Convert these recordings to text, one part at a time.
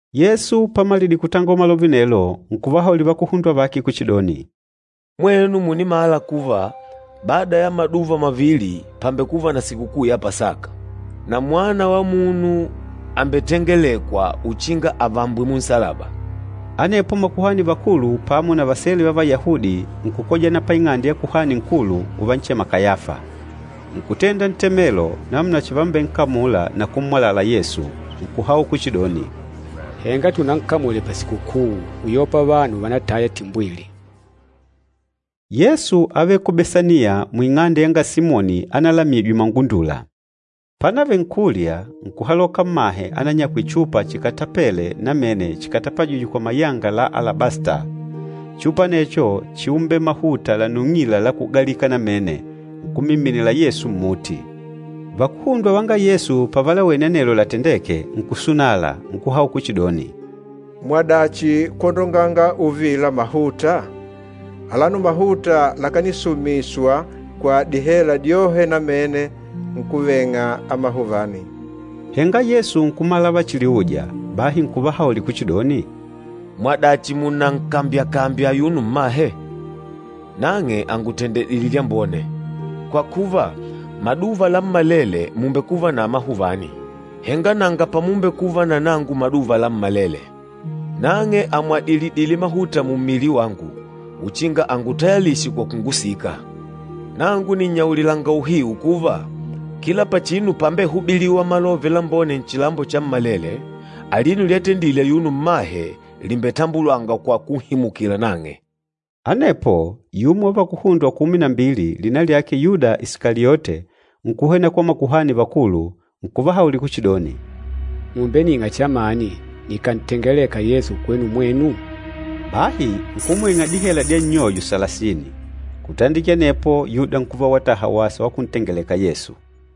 Yesu pamalidile kutangola malove anelo, nkuvahaulila vakuhundwa vake kuchidoni, “Mwenu mùnimala kuva bada ya maduva mavili pàmbekuva na sikukuu ya Pasaka, na Mwana wa Munu àmbetengelekwa uchinga avambwe munsalaba.” Anepo makuhani vakulu pamo na vasele va Vayahudi nkukojana paing'ande ya Kuhani Nkulu, uvanchema Kayafa. Nkutenda ntemelo namuna chivambenkamula na kummwalala Yesu. Nkuhaula kuchidoni, “Henga tunankamule pasikukuu, uyopa vanu vanataya timbwili.” Yesu ávele ku Besaniya muing'ande yanga Simoni analamijwe mangundula. Pánavele nkulya, nkuhaloka mmahe ananyakwile chupa chikatapele namene chikatapajîjwe kwa mayanga la alabasta. Chupa anecho chíumbele mahuta lanung'ila la kugalika namene, nkummiminila Yesu mmuti. Vakuhundwa vanga Yesu pavalawene anelo latendêke nkusunala, nkuhaula kuchidoni, “Mwadachi kwondonganga uvila mahuta? Alano mahuta lakanisumiswa kwa dihela dyohe namene nkuveng'a amahuvani!” Henga Yesu nkumala lavachiliuja, bahi nkuvahaulila kuchidoni, “Mwadachi munankambyakambya ayuno mmahe? Nang'e àngutendedile lyambone. Kwa kuva, maduva lammalele mùmbekuva na amahuvani, henga nanga pamumbekuva na nangu maduva lammalele. Nang'e àmwadilidile mahuta mummili wangu, uchinga angutayalishe kwa kungusika. Nangu nìnnyaulilanga uhiu kuva, kila pachinu pámbehubilîwa Malove Lambone nchilambo chammalele, alino lyatendile ayuno mmahe lìmbetambulangwa kwa kunhimukila nang'e.” Anepo, yumo wa vakuhundwa kumi na mbili, lina lyake Yuda Isikaliote, nkuhwena kwa makuhani vakulu, nkuvahaulila kuchidoni, “Mùmbening'a chamani nikantengeleka Yesu kwenu mwenu?” Bahi nkumwing'a dihela dya nnyoyo salasini. Kutandikila anepo Yuda nkuva wataha wasa wa kuntengeleka Yesu.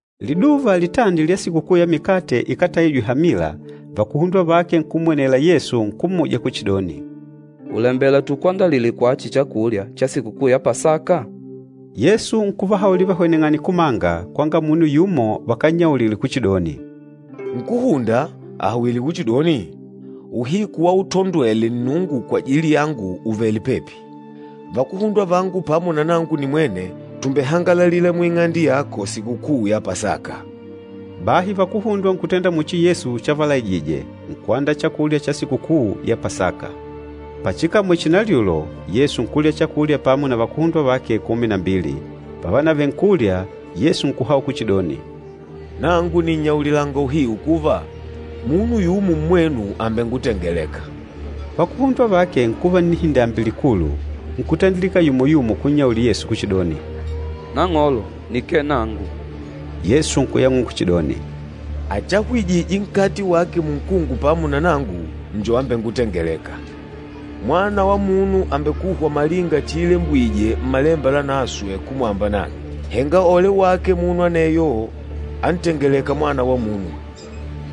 Liduva litandi lya Sikukuu ya Mikate Ikátaijwe Hamila, vakuhundwa vake nkummwenela Yesu nkummuja kuchidoni, “Ùlembela tukakwandalile kwachi chakulya cha Sikukuu ya Pasaka?” Yesu nkuvahaulila vahweneng'ane kumanga, kwanga munu yumo vakannyaulile kuchidoni, “Nkúhunda àhawile kuchidoni, ‘Uhiku wautondwele Nnungu kwajili yangu ùvele pepi, vakuhundwa vangu pamo na nangu nimwene tùmbehangalalila muing'ande yako Sikukuu ya Pasaka.’” Bahi vakuhundwa nkutenda muchi Yesu chavalaijije, nkuandaa chakulya cha Sikukuu ya Pasaka. Pachikamwele chinalyulo, Yesu nkulya chakulya pamo na vakuhundwa vake kumi na mbili. Pavanavele nkulya, Yesu nkuhaula kuchidoni, “Nangu nìnnyaulilanga uhiu kuva, munu yumo mmwenu àmbengutengeleka.” Vakuhundwa vake nkuva nnihindambi likulu, nkutandilika yumo-yumo kunnyaulila Yesu kuchidoni, “Nang'olo, nikee nangu!” Yesu nkuyang'ula kuchidoni, “Achahwijîje nkate wake munkungu pamo na nangu njo ambengutengelêka. Mwana wa Munu àmbekuhwa malinga chiilembwije Mmalemba Lanaswe kumwamba nang'e. Henga ole wake munu aneyo antengelêka Mwana wa Munu!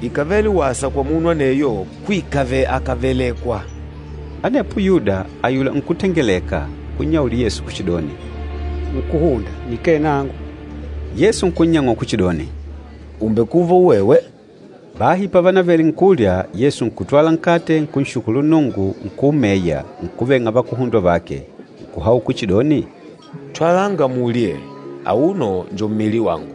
Ikàvele wasa kwa munu aneyo kuikave akavelekwa.” Anepo Yuda, ayula nkútengeleka, nkunnyaulila Yesu kuchidoni, “Nkúhunda, nikee nangu!” Yesu nkunnyang'ula kuchidoni, “Ùmbekuva uwewe.” Bahi pavanavele nkulya, Yesu nkutwala nkate, nkunshukulu Nnungu, nkuumeya, nkuveng'a vakuhundwa vake. Nkuhaula kuchidoni, “Twalanga mulye, auno njo mmili wangu.”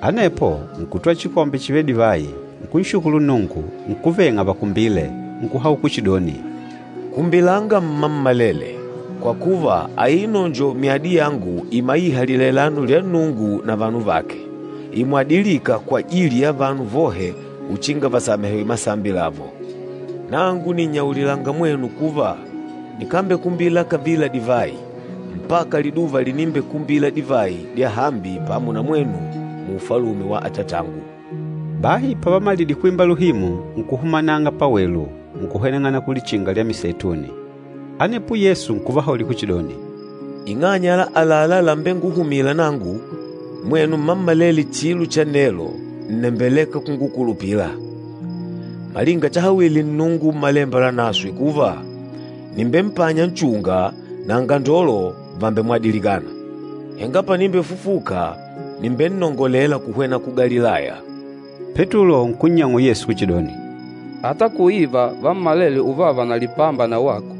Anepo, nkutwala chikombe chivêle divayi, nkunshukulu Nnungu, nkuveng'a vakumbile, nkuhaula kuchidoni, “Kumbilanga mmammalele, kwa kuva, aino njo myadi yangu imaîha lilailano lya Nnungu na vanu vake, imwadilîka kwajili ya vanu vohe uchinga vasamehewe masambi lavo. Nangu nìnnyaulilanga mwenu kuva, nikambekumbila kavila divayi, mpaka liduva linimbekumbila divayi dyahambi pamo na mwenu mu Ufalume wa Atatangu.” Bahi pavamalidile kwimba luhimu, nkuhumananga pawelu, nkuhweneng'ana ku Lichinga lya Miseituni. Anepo Yesu nkuvahaulila kuchidoni, “Ing'anya ya àlalá lambenguhumîla nangu, mwenu mmammalele chilo cha nelo ǹnembeleka kungukulupila, malinga chahawile Nnungu Mmalemba Lanaswe kuva, ‘Nìmbempanya nchunga, na angandolo vàmbemwadilikana.’ Henga panimbefufuka, nìmbennongolela kuhwena ku Galilaya.” Petulo nkunnyang'ula Yesu kuchidoni, “Ata kuiva vammalele uvava na lipamba na wako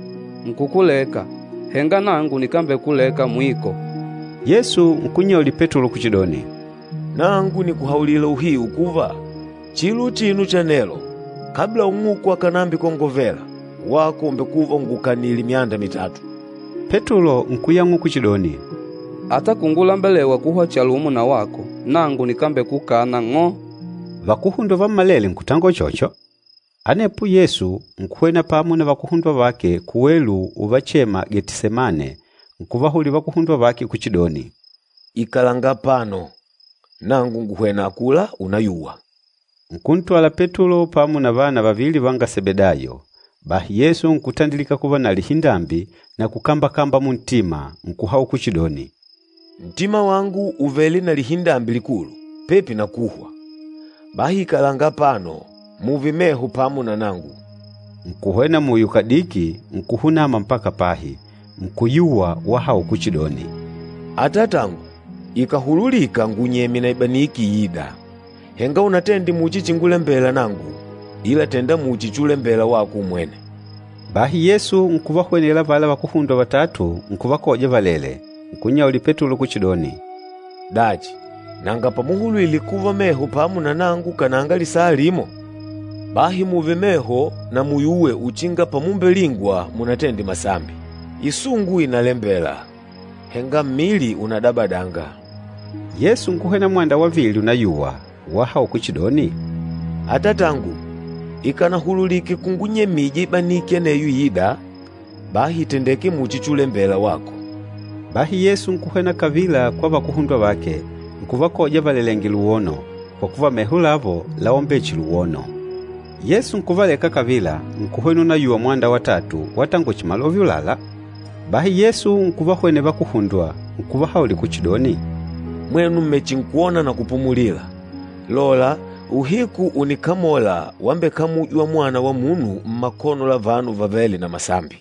nkukuleka, henga nangu nikambekuleka mwiko.” Yesu nkunnyaulila Petulo kuchidoni, “Nangu nìkuhaulila uhiu kuva, chilo uchino cha nelo, kabla ung'uku akànambikongovela, wako ùmbekuva ungukanile myanda mitatu.” Petulo nkuyang'ula kuchidoni, “Ata kungulembelewa kuhwa chalumo na wako, nangu nikambekukana ng'o!” Vakuhundwa vammalele nkutangola uchocho. Anepo Yesu nkuhwena pamo na vakuhundwa vake kuwelu uvachema, Getisemane, nkuvahaulila vakuhundwa vake kuchidoni, “Ikalanga apano, nangu nguhwena akula unayuwa.” Nkuntwala Petulo pamo na vana vavili vanga Sebedayo. Bahi Yesu nkutandilika kuva na lihindambi na kukambakamba muntima, nkuhaula kuchidoni, “Ntima wangu ùvele na lihindambi likulu, pepi na kuhwa. Bahi ikalanga apano, mùùve meho pamo na nangu.” Nkuhwena muyo kadiki, nkuhunama mpaka pahi, nkuyuwa wahaula kuchidoni, “Atatangu, ikàhululika ngunyemye na ibaniki iîda! Henga unatende muchi chingulembela nangu, ila tènda muchi chulembela wako umwene.” Bahi Yesu nkuvahwenela avala vakuhundwa vatatu, nkuvakoja valèlè, nkunnyaulila Petulo kuchidoni, “Dachi, nanga pamuhulwile kuva meho pamo na nangu kananga lisaa limo? Bahi mùùve meho na muyuwe uchinga pamumbelingwa munatende masambi. Isungu ìnalembela, henga mmili unadabadanga.” Yesu nkuhwena mwanda wavili unayuwa, wahaula kuchidoni, “Atatangu, ikánahululike kungunyemija ibaniki aneyo iîda, bahi ìtendeke muchi chulembela wako.” Bahi Yesu nkuhwena kavila kwa vakuhundwa vake, nkuvakoja valelèngè luwono, kwa kuva meho lavo láumbele chihi luwono. Yesu nkuvaleka kavila, nkuhwena unayuwa mwanda watatu watangola chihi malove ulala. Bahi Yesu nkuvahwenela vakuhundwa, nkuvahaulila kuchidoni, “Mwenu mmechinkwona na kupumulila. Lola uhiku ùnikamola wambekamujwa Mwana wa Munu mmakono la vanu vavêle na masambi.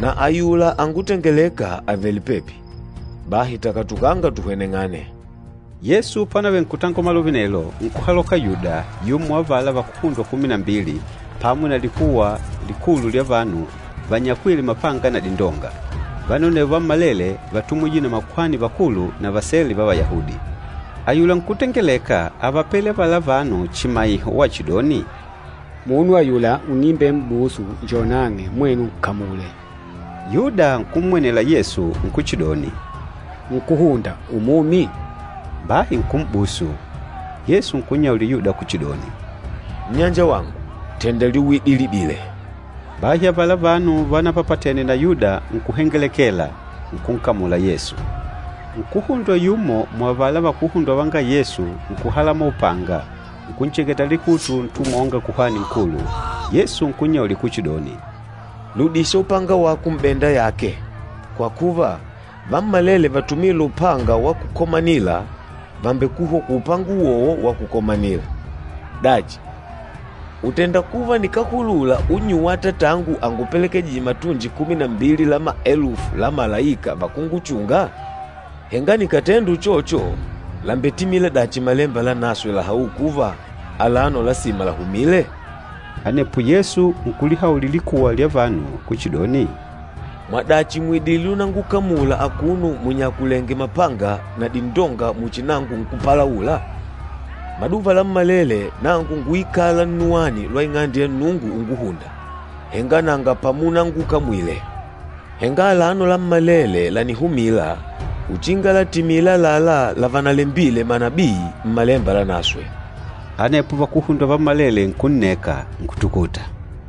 Na ayula angutengelêka àvele pepi, bahi takatukanga tuhweneng'ane!” Yesu pánavele nkutangola malove anelo, nkuhaloka Yuda, yumo wa avala vakuhundwa kumi na mbili, pamo na likuwa likulu lya vanu vanyakwîle mapanga na dindonga. Vanu anevo vammalele vátumwije na makuhani vakulu na vasele va Vayahudi. Ayula nkútengeleka ávapele avala vanu chimaiho wachidoni, “Munu ayula unimbem'busu njo nang'e, mwenu nkamule!” Yuda nkummwenela Yesu nkuchidoni, “Nkúhunda, umumi?” Bahi nkum'busu. Yesu nkunnyaulila Yuda kuchidoni, “Nnyanjawangu, tènda lyuwidilidile.” Bahi avala vanu vanapapatene na Yuda nkuhengelekela, nkunkamula Yesu. Nkuhundwa yumo muavala vakuhundwa vanga Yesu nkuhalamola upanga, nkuncheketa likutu ntumwa wanga Kuhani Nkulu. Yesu nkunnyaulila kuchidoni, “Ludisha upanga wako m'benda yake. Kwa kuva, vammalele vatumîla upanga wa kukomanila, vambekuhwa kwa upanga uwowo wa kukomanila. Dachi, ùtenda kuva nikáhulula unnyuwa Atatangu angupelekejije matunji kumi na mbili la maelufu la malaika vakunguchunga? Henga nikàtenda uchocho làmbetimila dachi Malemba Lanaswe lahaûla kuva, alano lasima lahumile?” Anepo Yesu nkulihaulila likuwa lya vanu kuchidoni, “Mwadachi mùidile unangukamula akuno munyakulèngè mapanga na dindonga muchi nangu nkúpalaula? Maduva lammalele nangu ngúikala nnuwani lwa Ing'ande ya Nnungu unguhùndà, henga nanga pamunangukamwile. Henga alano lammalele lànihumila, uchinga latimile àlalá lavanalembile manabii Mmalemba Lanaswe.” Anepo vakuhundwa vammalele nkunneka, nkutukuta.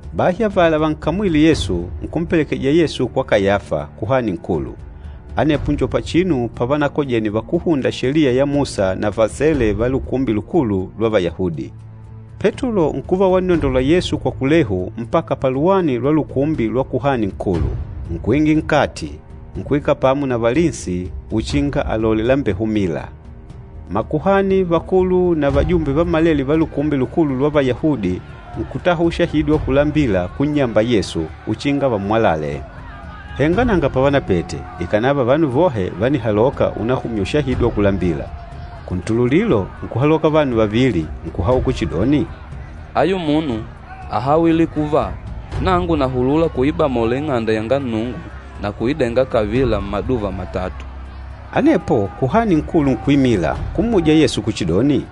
Bahi avala vankamwîle Yesu, nkumpelekeja Yesu kwa Kayafa, Kuhani Nkulu. Anepo njo pachinu pavanakojene vakúhunda Sheliya ya Musa na vasele va Lukumbi Lukulu lwa Vayahudi. Petulo nkuva wannondola Yesu kwa kulehu mpaka paluwani lwa lukumbi lwa Kuhani Nkulu. Nkuingila nkati, nkuikala pamo na valinsi uchinga alalole lambehumîla. Makuhani vakulu na vajumbe vammalele va Lukumbi Lukulu lwa Vayahudi nkutaha ushahidi wa kulambila kunnyamba Yesu, uchinga vammwalale. Henga nanga pavanapete, ikànava vanu vohe vánihaloka unahumya ushahidi wa kulambila. Kuntululilo, nkuhaloka vanu vavili, nkuhaula kuchidoni, “Ayu munu áhawile kuva, ‘Nangu nahulula kuibamola Ing'ande yanga Nnungu na kuidenga kavila mmaduva matatu.’” Anepo Kuhani Nkulu nkuimila, nkummuja Yesu kuchidoni,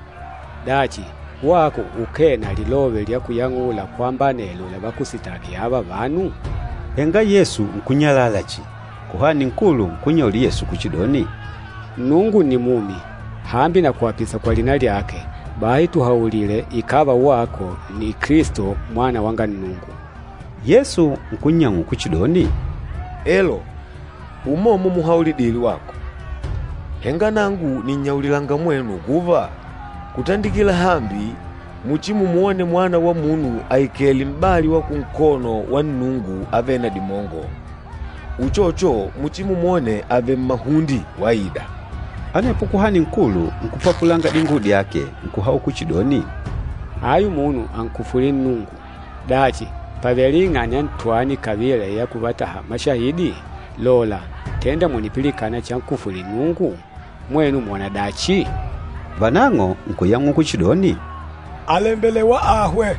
“Dachi, wako ukee na lilove lya kuyang'ula kwamba anelo lavakusitaki ava vanu?” Henga Yesu nkunyalala chihi. Kuhani Nkulu nkunnyaulila Yesu kuchidoni, “Nnungu nni mumi, hambi nakuapisa kwa lina lyake, bahi tuhaulile ikàva wako nni Kilisto, Mwana wanga Nnungu.” Yesu nkunnyang'ula kuchidoni, “Elo, umomo muhaulidile wako. Henga nangu nìnnyaulilanga mwenu kuva, kutandikila hambi muchimumwone Mwana wa Munu aikèlè m'bali wa kunkono wa Nnungu Avêle na Dimongo, uchocho muchimumwone avèlè mmahunde waida.” Anepo Kuhani Nkulu nkupapulanga dinguwo dyake, nkuhaula kuchidoni, “Ayu munu ànkufwîle Nnungu! Dachi, pàvele ing'anya ntwani kavila ya kuvataha mashahidi? Lola, tênda mùnipilikana chankufwîle Nnungu? Mwenu mwona dachi?” Vanang'o nkuyang'ula kuchidoni, “Àlembelewa ahwe.”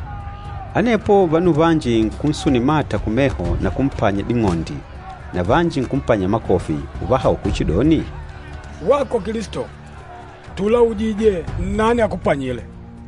Anepo vanu vanji nkunsunila mata kumeho na kumpanya ding'ondi. Na vanji nkumpanya makofi, uvahaula kuchidoni, “Wako Kilisto, tùlaujije, nnani akupanyile!”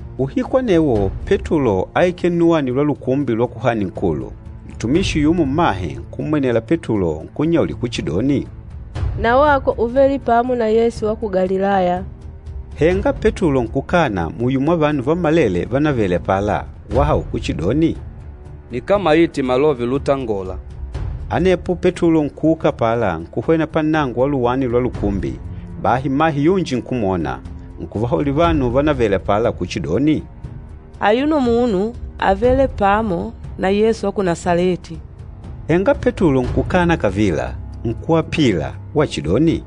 Uhiku anewo Petulo áikele nnuwani lwa lukumbi lwa Kuhani Nkulu. Ntumishi yumo mmahe, nkummwenela Petulo nkunnyaulila kuchidoni, “Na wako úvele pamo na Yesu wa ku Galilaya.” Henga Petulo nkukana muyo mwa vanu vammalele vánavele apala, wahaula kuchidoni, “Nikámaite malove lutangola.” Anepo Petulo nkuuka apala nkuhwena pannango wa luwani lwa lukumbi, bahi mmahe yunji nkumwona, nkuvahaulila vanu vánavele apala kuchidoni, “Ayuno munu ávele pamo na Yesu wa ku Nasaleti.” Henga Petulo nkukana kavila, nkuapila wachidoni,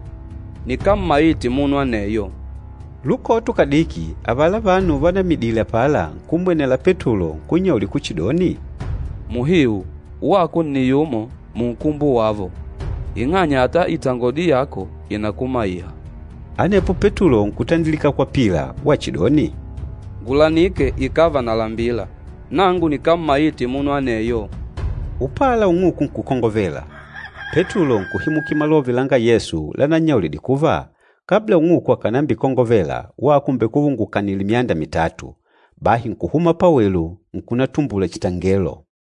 “Nikámmaite munu aneyo!” Lukoto kadiki avala vanu vanaimidile apala, nkummwenela Petulo nkunnyaulila kuchidoni, “Muhiu wako nni yumo munkumbo wavo, ing'anya ata itangodi yako ìnakumaiha.” Anepo Petulo nkutandilika kwapila wachidoni, “Ngulanike ikàva nalambila! Nangu nikámmaite munu aneyo!” Upala ung'uku nkukongovela. Petulo nkuhimukila malove langa Yesu lanannyaulidile kuva, “Kabla ung'uku akànambikongovela, wako ùmbekuva ungukanìlè myanda mitatu.” Bahi nkuhuma pawelu, nkunatumbula chitangelo.